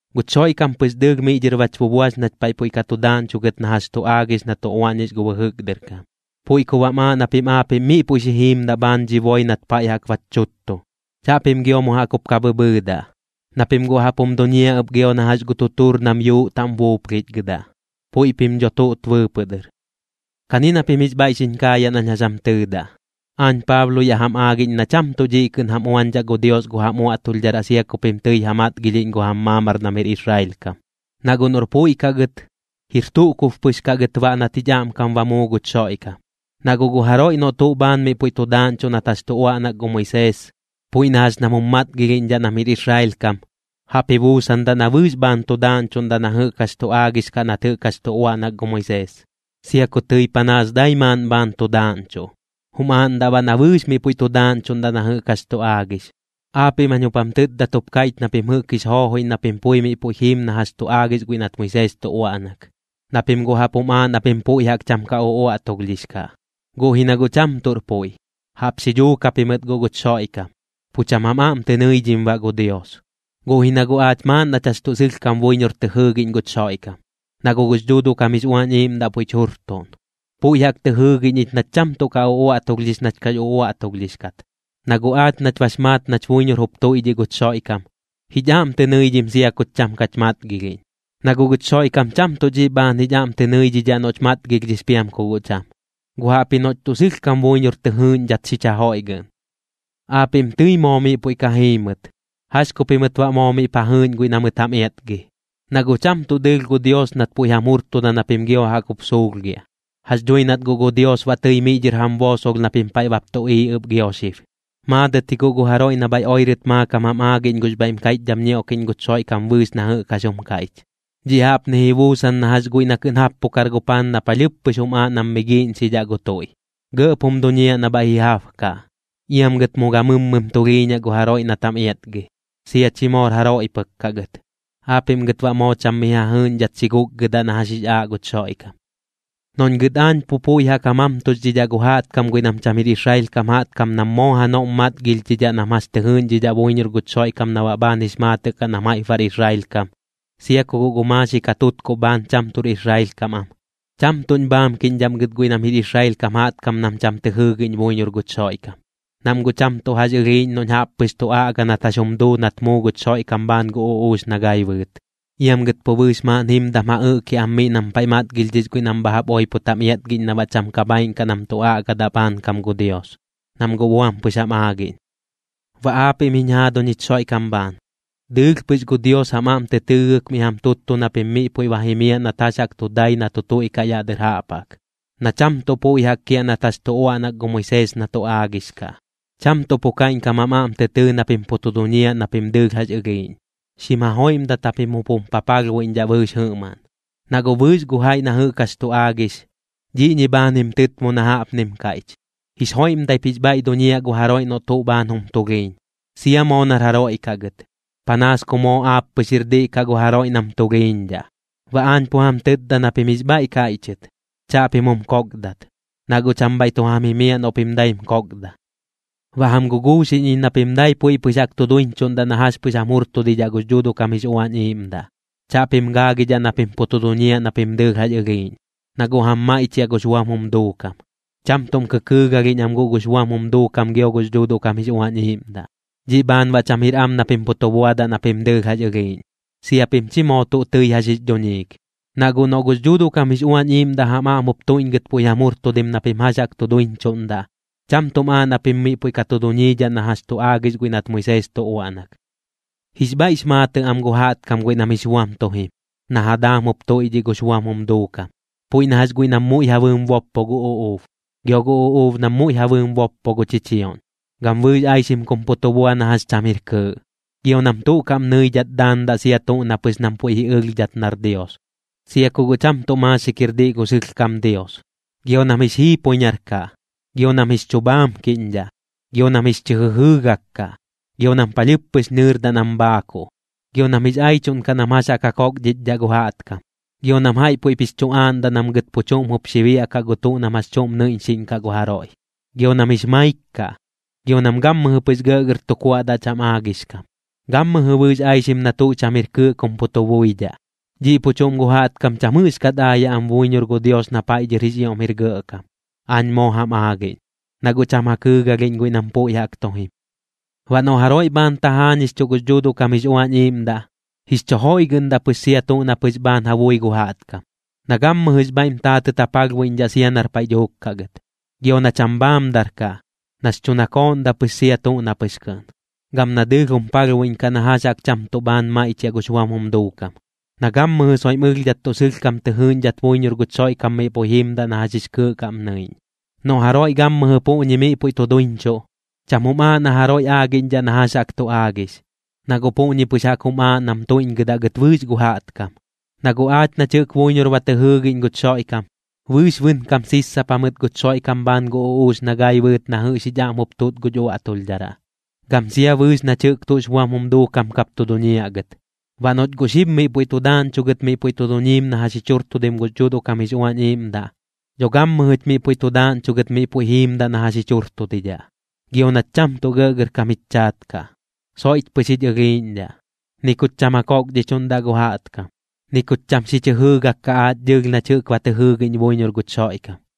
Guch Xoiꞌkam pɨx dɨɨlh miꞌ dhɨr bach bubuax nach paiꞌ puiꞌ ka tu daaꞌñchugɨt na jax tu aagix na tu uaꞌñix gu bɨjɨk dɨr kam. Puiꞌ ku baꞌm aaꞌ na pim aapiꞌm miꞌ puiꞌ xi jiimdaꞌ bhaan dhi boi nat paiꞌ jaꞌk bach chuttu. Chaꞌpim gio mu jaꞌk jup ka bhɨbhɨɨdaꞌ, na pim guꞌ jaꞌp jum duñiaꞌ ɨp gio na jax gu tutuur nam yuuꞌ taꞌm buuplhichgɨdaꞌ. Puiꞌ pim dho tuꞌt bɨɨpɨꞌ dɨr. Kani na pim jix bhaiꞌ xiñ kaayaꞌ nañ jax jam tɨɨdaꞌ. Aañ Paablo yaꞌ jam aagiꞌñ na cham tuꞌ dhiꞌ kɨꞌn jam uañdhaꞌ gu Dios gu jam uaꞌtulhdharaꞌ sia ku pim tɨi ja matgilhiꞌñ gu jam maamar nam jir Israel kam. Na guꞌ noꞌr puiꞌ kaꞌ gɨt, jir tuꞌ kub pɨx kaꞌ gɨt baꞌ nat jich aꞌmkam ba muu guch Xoiꞌkam. Na guꞌ gu jaroiꞌ noꞌ tuꞌ bhaan miꞌ puiꞌ tu daaꞌñchuꞌ nat jax tu uaꞌnak gu Moisees, puiꞌ na jax nam jum matgilhiꞌñdhaꞌ nam jir Israel kam, jaꞌp ji buusandaꞌ na bɨɨx bhaan tu daaꞌñchuꞌndaꞌ na jɨꞌk jax tu aagix kaꞌ nat jɨꞌk jax tu uaꞌnak gu Moisees, sia ku tɨi panaas dai maaꞌn bhaan tu daaꞌñchuꞌ. Jum aaꞌndaꞌ baꞌ na bɨɨx miꞌ puiꞌ tu daaꞌñchuꞌndaꞌ na jɨꞌk jax tu aagix. Aapiꞌm jañ jup jam tɨtdat jup kaiꞌch na pim jɨꞌk jix joojoiꞌñ na pim pui miꞌ puiꞌ jiim na jax tu aagix guiꞌ nat Moisees tu uaꞌnak, na pim guꞌ jaꞌp jum aaꞌ na pim puiꞌ jaꞌk cham ka uꞌuaꞌtulhdhix kaꞌ. Guꞌ ji na guꞌ cham tuꞌr puiꞌ, jaꞌp xi dhuuk japimɨt guꞌ guch Xoiꞌkam, pu cham jam aꞌm tɨ nɨidhim baꞌ gu Dios. Guꞌ ji na guꞌ aach maaꞌn nach jax tuꞌ sɨlhkam buiñor tɨ jɨɨgiꞌñ guch Xoiꞌkam, na guꞌ gux Dhuuduꞌ kam jix Uañ Iiꞌmdaꞌ puiꞌch jurtuꞌn. Puiꞌ jaꞌk tɨ jɨɨgiꞌñ ich nach cham tuꞌ ka uꞌuaꞌtulhdhix nach kax uꞌuaꞌtulhdhix kat. Na guꞌ aach nach bax maat nach buiñor jup tuiꞌdhiꞌ guch Xoiꞌkam, jich aꞌm tɨ nɨidhim sia kuch cham kach matgilhiꞌñ. Na guꞌ guch Xoiꞌkam cham tuꞌ dhiꞌ bhaan jich aꞌm tɨ nɨidhidhaꞌ noꞌch matgilhdhix piam ku guꞌ cham, guꞌ jaꞌpji noꞌch tuꞌ sɨlhkam buiñor tɨ jɨɨꞌñdhat xich jajoiꞌgɨꞌn. Aapiꞌm tɨi moo miꞌ puiꞌ ka jiimɨt. ¿Jax ku pimɨt baꞌ moo miꞌp ja jɨɨꞌñ guiꞌ na mɨt jam iatgi? Na guꞌ cham tuꞌ dɨɨlh gu Dios nat puiꞌ jam jurtuda na pim gio jaꞌk jup suulhgiaꞌ. Jax dhui nat guꞌ gu Dios baꞌ tɨi miꞌ dhɨr jam boosolh na pim paiꞌ bap tuꞌiiꞌ ɨp gio xib. Maadɨt ji guꞌ gu jaroiꞌ na bhaiꞌ oirɨt maakam jam aagiꞌñ gux bhaiꞌm kaiꞌchdham ñioꞌkiꞌñ guch Xoiꞌkam bɨɨx na jɨꞌk jax jum kaiꞌch. Dhiꞌ jaꞌpni ji buusan na jax guiꞌ na kɨꞌn jappukar gu paan na palhɨɨp pɨx jum aaꞌ nam mi giiꞌñxidhaꞌ gu tuiꞌ, gɇꞌp jum duñiaꞌ na bhaiꞌ ji jabkaꞌ. Iam gɨt mu gamɨmmɨm tulhiiñaꞌ gu jaroiꞌ nat jam iatgi, sia chi moor jaroiꞌ pɨk kaꞌ gɨt. Aapiꞌm gɨt baꞌ moo cham mi ja jɨɨꞌñdhat xi guꞌkgɨdaꞌ na jax jix aaꞌ guch Xoiꞌkam. Noꞌñ gɨt aañ pu puiꞌ jaꞌk ja mamtuxdhidhaꞌ gu jaꞌtkam guiꞌ nam cham jir Israel kam nam moo janoꞌm matgilhdhidhaꞌ nam jax tɨ jɨɨꞌñdhidhaꞌ buiñor guch Xoiꞌkam na baꞌ bhaan jix maatɨꞌ kaꞌ nam jaiꞌp bar Israel kam, sia ku guꞌ gu maaxik ja tutkuꞌ bhaan cham tuꞌr Israel kam am, cham tuꞌñ bhaamkiꞌñdhaꞌm gɨt guiꞌ nam jir Israel kam jaꞌtkam nam cham tɨ jɨɨgiꞌñ buiñor guch Xoiꞌkam, nam guꞌ cham tuꞌ jax ɨlhiiꞌñ noꞌñ jaꞌp pɨx tu aꞌga nat jax jum duu nat muu guch Xoiꞌkam bhaan gu uꞌuux na gai bɨɨt. Iam gɨt pu bɨɨx maaꞌn jimdam ja ɨꞌkiaꞌ am miꞌ nam paiꞌ matgilhdhix guiꞌ nam bha jaꞌp oipot jam iatgiꞌñ na baꞌ cham ka bhaaiꞌn kaꞌ nam tu aꞌgadaꞌ bhaankam gu Dios, nam guꞌ buam pɨx jam aagiꞌñ. Baꞌ aapiꞌm jiñ jaaduñ jich Xoiꞌkam bhaan, dɨɨlh pɨx gu Dios jam aꞌm tɨ tɨɨgɨk miꞌ jam tuttu na pim miꞌ puiꞌ ba jimiaꞌ nat jax jaꞌk tu dai na tu tuiꞌkaꞌ yaꞌ dɨr jaꞌp jaꞌk, na cham tuꞌ puiꞌ jaꞌk kiaꞌ nat jax tu uaꞌnak gu Moisees na tu aagix kaꞌ. Cham tuꞌ pu kaiꞌñkam jam aꞌm tɨ tɨɨ na pim pu tu duñiaꞌ na pim dɨɨlh jax ɨlhiiꞌñ. Xim jajoiꞌmdat japim jup jum papalhbuiꞌñdhaꞌ bɨɨx jɨꞌmaꞌn, na guꞌ bɨɨx gu jaiꞌ na jɨꞌk jax tu aagix, dhiꞌñi bhaan jim tɨtmo na jaꞌpnim kaiꞌch: “Jix joiꞌmdaip jix bhaiꞌ duñiaꞌ gu jaroiꞌ noꞌ tuꞌ bhaan jum tulhiiñ, sia moo nar jaroiꞌ kaꞌ gɨt, panaas ku moo aap pɨx jir diꞌ kaꞌ gu jaroiꞌ nam tulhiiñdhaꞌ.” Baꞌ aañ pu jam tɨtda na pim jix bhaiꞌ kaiꞌchɨt, chaꞌpim jum koꞌkdat, na guꞌ cham bhaiꞌ tu jam jimiaꞌ noꞌ pim daim koꞌkda. Baꞌ jam guguuxiꞌñ iñ na pim dai puiꞌ pɨx jaꞌk tu duiñchuꞌndaꞌ na jax pɨx jam jurtudidhaꞌ gux Dhuuduꞌ kam jix Uañ Iiꞌmdaꞌ. Chaꞌpim gaagidhaꞌ na pim pu tu duñiaꞌ na pim dɨɨlh jax ɨlhiiꞌñ, na guꞌ jam maiꞌchiaꞌ gux buam jum duukam. Cham tuꞌm kɨkɨɨgalhiꞌñ am guꞌ gux buam jum duukam gio gux Dhuuduꞌ kam jix Uañ Iiꞌmdaꞌ, dhiꞌ bhaan baꞌ cham jir am na pim pu tu buadaꞌ na pim dɨɨlh jax ɨlhiiꞌñ, sia pim chi moo tuꞌ tɨi jax jix dhuñiik. Na guꞌ noꞌ gux Dhuuduꞌ kam jix Uañ Iiꞌmdaꞌ jam aꞌm jup tuiꞌñgɨt puiꞌ jam jurtudim na pim jax jaꞌk tu duiñchuꞌndaꞌ, cham tuꞌm aaꞌ na pim miꞌ puiꞌ ka tu duñiidhaꞌ na jax tu aagix guiꞌ nat Moisees tu uaꞌnak. Jix bhaiꞌx maatɨꞌ am gu jaꞌtkam guiꞌ nam jix buam tu jim, na ja daam jup tuiꞌdhiꞌ gux buam jum duukam. Puiꞌ na jax guiꞌ nam muiꞌ ja bɨɨm boppo gu uꞌuub, gio gu uꞌuub nam muiꞌ ja bɨɨm boppo gu chichioꞌñ, gam bɨɨx aixim kum pu tu bua na jax cham jir kɨɨꞌ. Gio nam tuꞌ kaꞌm nɨidhat daandaꞌ sia tuꞌ na pɨx nam puiꞌ ji ɨlhdhat nar dios, sia ku guꞌ cham tuꞌ maaxik jir diꞌ gu sɨlhkam Dios. Gio nam jix jiipoiñar kaꞌ. Gio nam jix chu bhaamkiꞌñdhaꞌ, gio nam jix chɨ jɨjɨɨgak kaꞌ, gio nam palhɨɨp pɨx nɨɨrdaꞌ nam bhaakuꞌ. Gio nam jix aichuꞌn kaꞌ nam jax jaꞌk ja kokdhichdhaꞌ gu jaꞌtkam. Gio nam jaiꞌ puiꞌp jix chu aaꞌndaꞌ nam gɨt pu chuꞌm jup xi biaꞌkaꞌ gu tuꞌ nam jax chuꞌm nɨiꞌñxiꞌñ kaꞌ gu jaroiꞌ. Gio nam jix maik kaꞌ, gio nam gammɨjɨ pɨx gɇꞌgɇr tu kuaꞌdaꞌ cham aagix kam, gammɨjɨ bɨɨx aixim na tuꞌ cham jir kɨɨꞌ kum pu tu buidhaꞌ. Dhiꞌ pu chuꞌm gu jaꞌtkam cham jɨꞌxkat aayaꞌ am buiñor gu Dios na paiꞌ dhɨr jix ioꞌm jir gɇꞌkam, aañ moo jam aagiꞌñ, na guꞌ cham ja kɨɨgalhiꞌñ guiꞌ nam puiꞌ jaꞌk tu jim. Baꞌ noꞌ jaroiꞌ bhaan tajaañixchuꞌ gux Dhuuduꞌ kam jix Uañ Iiꞌmdaꞌ, jix chu joiꞌgɨꞌndaꞌ pɨx sia tuꞌ na pɨx bhaan ja bui gu jaꞌtkam, na gammɨjɨx bhaiꞌm taatɨt ja palhbuiꞌñdhaꞌ sia nar paiꞌ dhuuk kaꞌ gɨt. Gio na cham bhaamdar kaꞌ, nax chu nakooꞌndaꞌ pɨx sia tuꞌ na pɨx kɨꞌn. Gam na dɨɨlh jum palhbuiꞌñkaꞌ na jax jaꞌk cham tuꞌ bhaan maiꞌchiaꞌ gux buam jum duukam. Na gammɨjɨ soiꞌm ɨlhdhat tuꞌ sɨlhkam tɨ jɨɨꞌñdhat buiñor guch Xoiꞌkam miꞌ puiꞌ jimdaꞌ na jax jix kɨɨꞌ kaꞌm nɨiꞌñ. Noꞌ jaroiꞌ gammɨjɨ puꞌñi miꞌ puiꞌ tu duiñchuꞌ, cham jum aaꞌ na jaroiꞌ aagiꞌñdhaꞌ na jax jaꞌk tu aagix, na guꞌ puꞌñi pɨx jaꞌk jum aaꞌ nam tuiꞌñgɨdaꞌ gɨt bɨɨx gu jaꞌtkam. Na guꞌ aach nach jɨꞌk buiñor ba tɨ jɨɨgiꞌñ guch Xoiꞌkam, bɨɨx bɨnkam sissapa mɨt guch Xoiꞌkam bhaan gu uꞌuux na gai bɨɨt na jɨꞌx jich aꞌm jup tuꞌt guch uꞌuaꞌtulhdharaꞌ, gam sia bɨɨx nach jɨꞌk tuꞌx buam jum duukam kap tu duñiaꞌ gɨt. Baꞌ noꞌch guꞌ xib miꞌ puiꞌ tu daaꞌñchugɨt miꞌ puiꞌ tu duñiim na jax jich jurtudim gux Dhuuduꞌ kam jix Uañ Iiꞌmdaꞌ, dho gammɨjɨch miꞌ puiꞌ tu daaꞌñchugɨt miꞌ puiꞌ jiimdaꞌ na jax jich jurtudidhaꞌ. Gio nach cham tuꞌ gɇꞌgɇrkam jich chaat kaꞌ, soiꞌch pɨx jich ɨlhiiꞌñdhaꞌ. Ni kuch cham ja kokdhichuꞌndaꞌ gu jaꞌtkam, ni kuch cham xich jɨjɨɨgak kaꞌ aach dɨɨlh nach jɨꞌk ba tɨ jɨɨgiꞌñ buiñor guch Xoiꞌkam.